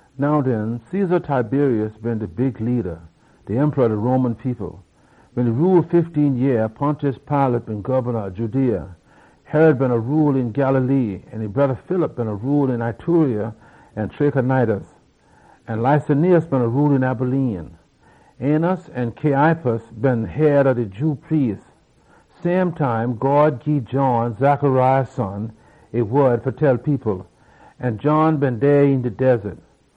Now den, Caesar Tiberius been de rula ob de Roman people. Wen e been rule fifteen yeah, Pontius Pilate been gobna ob Judea. Herod beena rule een Galilee, an e broda, Philip, beena rule een Iturea an Trachonitis. An Lysanias beena rule een Abilene. Annas an Caiaphas been head ob de Jew priest dem. Same time, God gii John, Zechariah son, e wod fa tell people. An John been dey een de wildaness.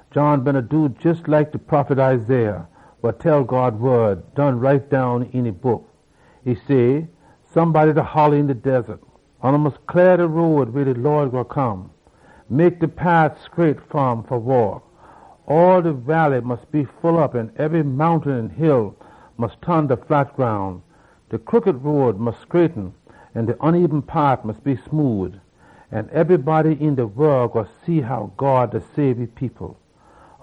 John beena do jes like de prophet Isaiah done write down een e book say, “Somebody da holla een de wildaness say, ‘Oona mus cleah de road weh de Lawd gwine come. Mek de pat scraight fa um fa waak! All de walley mus be full op, an ebry mountain an hill mus ton ta flat groun. De crooked road mus scraighten, an de bad road mus be smood. An ebrybody een de wol gwine see how God da sabe e people!’”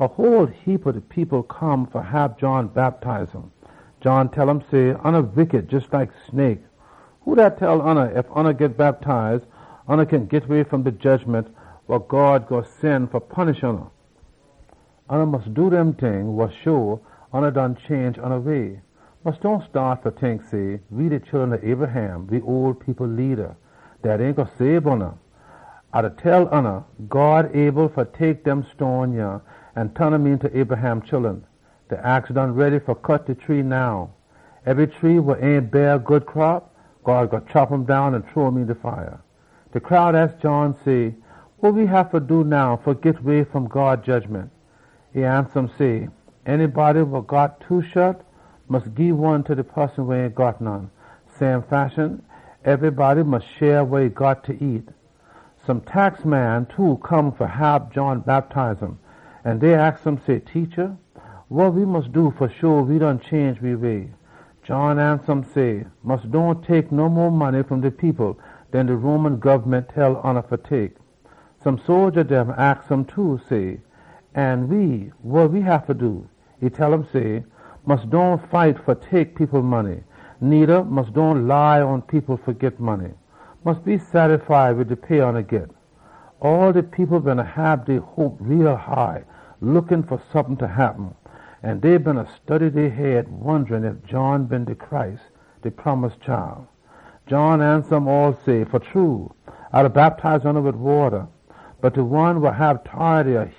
A whole heapa people come fa hab John bactize um. John tell um say, “Oona wickity, jes like snake! Who tell oona dat ef oona git bactize, oona kin git way fom de jedgiment wa God gwine sen fa punish oona? Oona mus do dem ting wa show oona done change oona way. Mus dohn tink say, ‘We de chullun ob Abraham.’ Dat ain gwine sabe oona. A da tell oona, God able fa tek dem stone yah an ton um eenta Abraham chullun! Now de ax ta de foot ob de tree. Ebry tree wa ain beah good fruit, God gwine cut um down an chunk um een de fire.” De crowd aks John say, “Wa we haffa do now fa git way fom God jedgiment?” E ansa um say, “Anybody wa got two coat mus gii one ta de poson wa ain got none. Same fashion, ebrybody mus share wa e got fa nyam.” Some tax man too come fa hab John bactize um. An dey aks um say, “Teacha, wa we mus do fa sho we done change we way?” John ansa um say, “Mus dohn tek no mo money fom de people den de Roman gobment tell oona fa tek.” Some sodja dem aks um too, say, “An we, wa we haffa do?” E tell um say, “Mus dohn fight fa tek people money. Needa, mus dohn lie on people fa git money. Mus be sattify wid de pay oona git.” All de people beena hab high hope, da look fa sompin fa happen. An dey beena study dey head, da wonda ef John been de Messiah. John ansa um all say, “A da bactize oona wid wata. Bot de one wa hab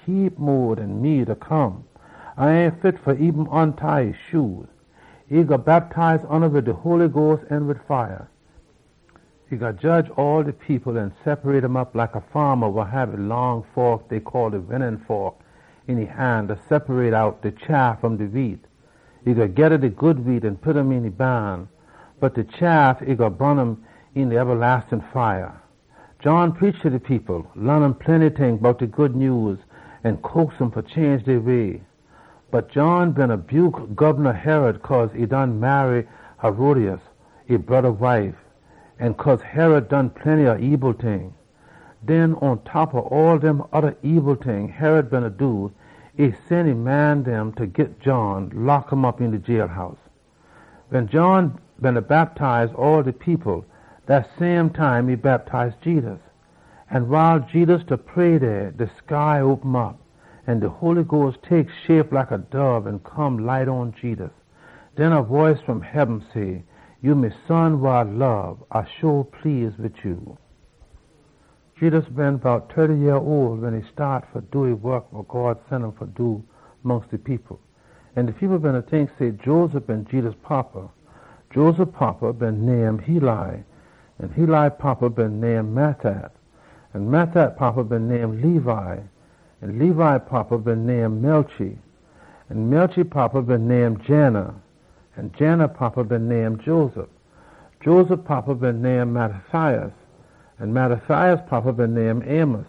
heap mo tority den me gwine come. A ain fit eben fa loose e shoe. E gwine bactize oona wid de Holy Sperit an wid fire. E gwine jedge all de people an separate um op like a faama wa hab e pitfork een e han fa separate out de chaff fom de wheat. E gwine geda de good wheat an pit um een e baan. Bot de chaff, e gwine bun um een de ebalastin fire.” John preach ta de people, laan um plenty ting bout de Good Nyews an coax um fa change dey way. Bot John beena buke Gobna Herod cause e done marry Herodias, e broda wife, an cause Herod done plenty oda ebil ting. Den pontop ob all dem oda ebil ting Herod beena do, e sen e man dem fa git John, lock um op een de jailhouse. Wen John beena bactize all de people, dat same time e bactize Jedus. An wiles Jedus da pray dey, de sky open op. An de Holy Sperit tek shape like a dob an come light pon Jedus. Den a boice fom heaben say, “Ya me Son wa A lob. A sho please wid ya.” Jedus been bout tirty yeah ole wen e staat fa do e wok wa God sen um fa do mongst de people. An de people beena tink say, Joseph been Jedus fada. Joseph fada been name Heli. Heli fada been name Matthat. Matthat fada been name Levi. Levi fada been name Melchi. Melchi fada been name Jannai. Jannai fada been name Joseph. Joseph fada been name Mattathias. Mattathias fada been name Amos.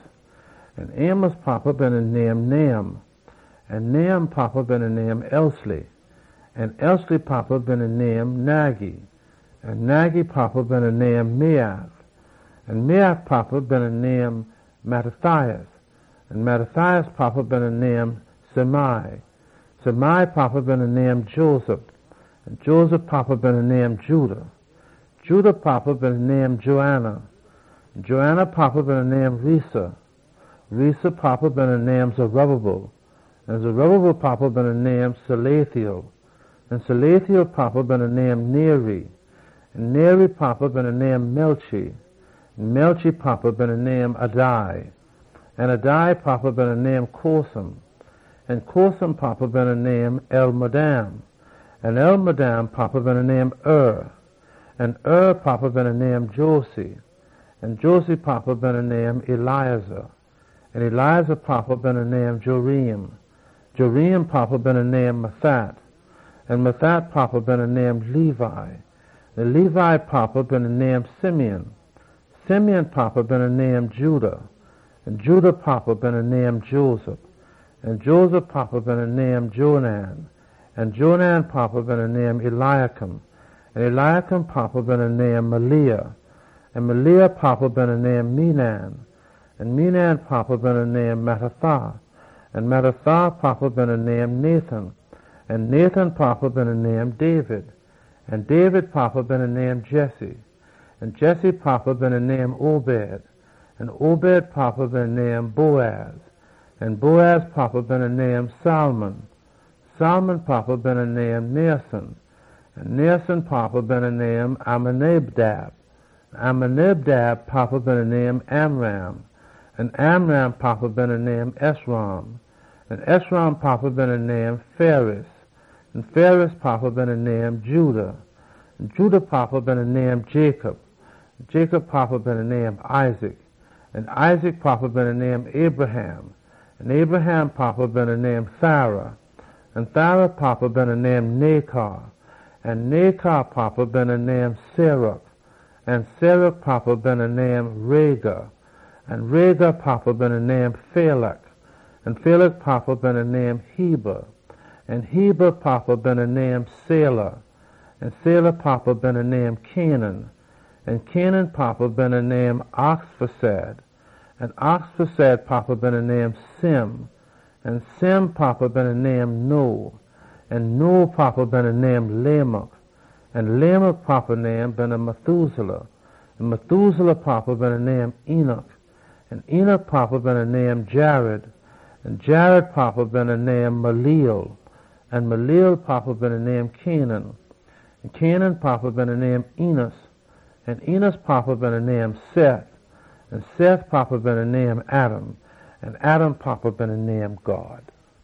Amos fada been name Nahum. Nahum fada been name Esli. Esli fada been name Naggai. Naggai fada been name Maath. Maath fada been name Mattathias. Mattathias fada been name Semein. Semein fada been name Josech. Josech fada been name Joda. Joda fada been name Joanan. Joanan fada been name Rhesa. Rhesa fada been name Zerubbabel. Zerubbabel fada been name Shealtiel. Shealtiel fada been name Neri. Neri fada been name Melchi. Melchi fada been name Addi. Addi fada been name Cosam. Cosam fada been name Elmadam. Elmadam fada been name Er. Er fada been name Joshua. Joshua fada been name Eliezer. Eliezer fada been name Jorim. Jorim fada been name Matthat. Matthat fada been name Levi. Levi fada been name Simeon. Simeon fada been name Judah. Judah fada been name Joseph. Joseph fada been name Jonam. Jonam fada been name Eliakim. Eliakim fada been name Melea. Melea fada been name Menna. Menna fada been name Mattatha. Mattatha fada been name Nathan. Nathan fada been name David. David fada been name Jesse. Jesse fada been name Obed. Obed fada been name Boaz. Boaz fada been name Salmon. Salmon fada been name Nahshon. Naasson fada been name Amminadab. Amminadab fada been name Aram. Aram fada been name Hezron. Hezron fada been name Perez. Perez fada been name Judah. Judah fada been name Jacob. Jacob fada been name Isaac. Isaac fada been name Abraham. Abraham fada been name Terah. Terah fada been name Nahor. Nahor fada been name Serug. Serug fada been name Reu. Reu fada been name Peleg. Peleg fada been name Eber. Eber fada been name Shelah. Shelah fada been name Cainan. Cainan fada been name Arphaxad. Arphaxad fada been name Shem. Shem fada been name Noah. Noah fada been name Lamech. Lamech fada been name Methuselah. Methuselah fada been name Enoch. Enoch fada been name Jared. Jared fada been name Mahalaleel. Mahalaleel fada been name Cainan. Cainan fada been name Enos. Enos fada been name Seth. Seth fada been name Adam. Adam fada been God.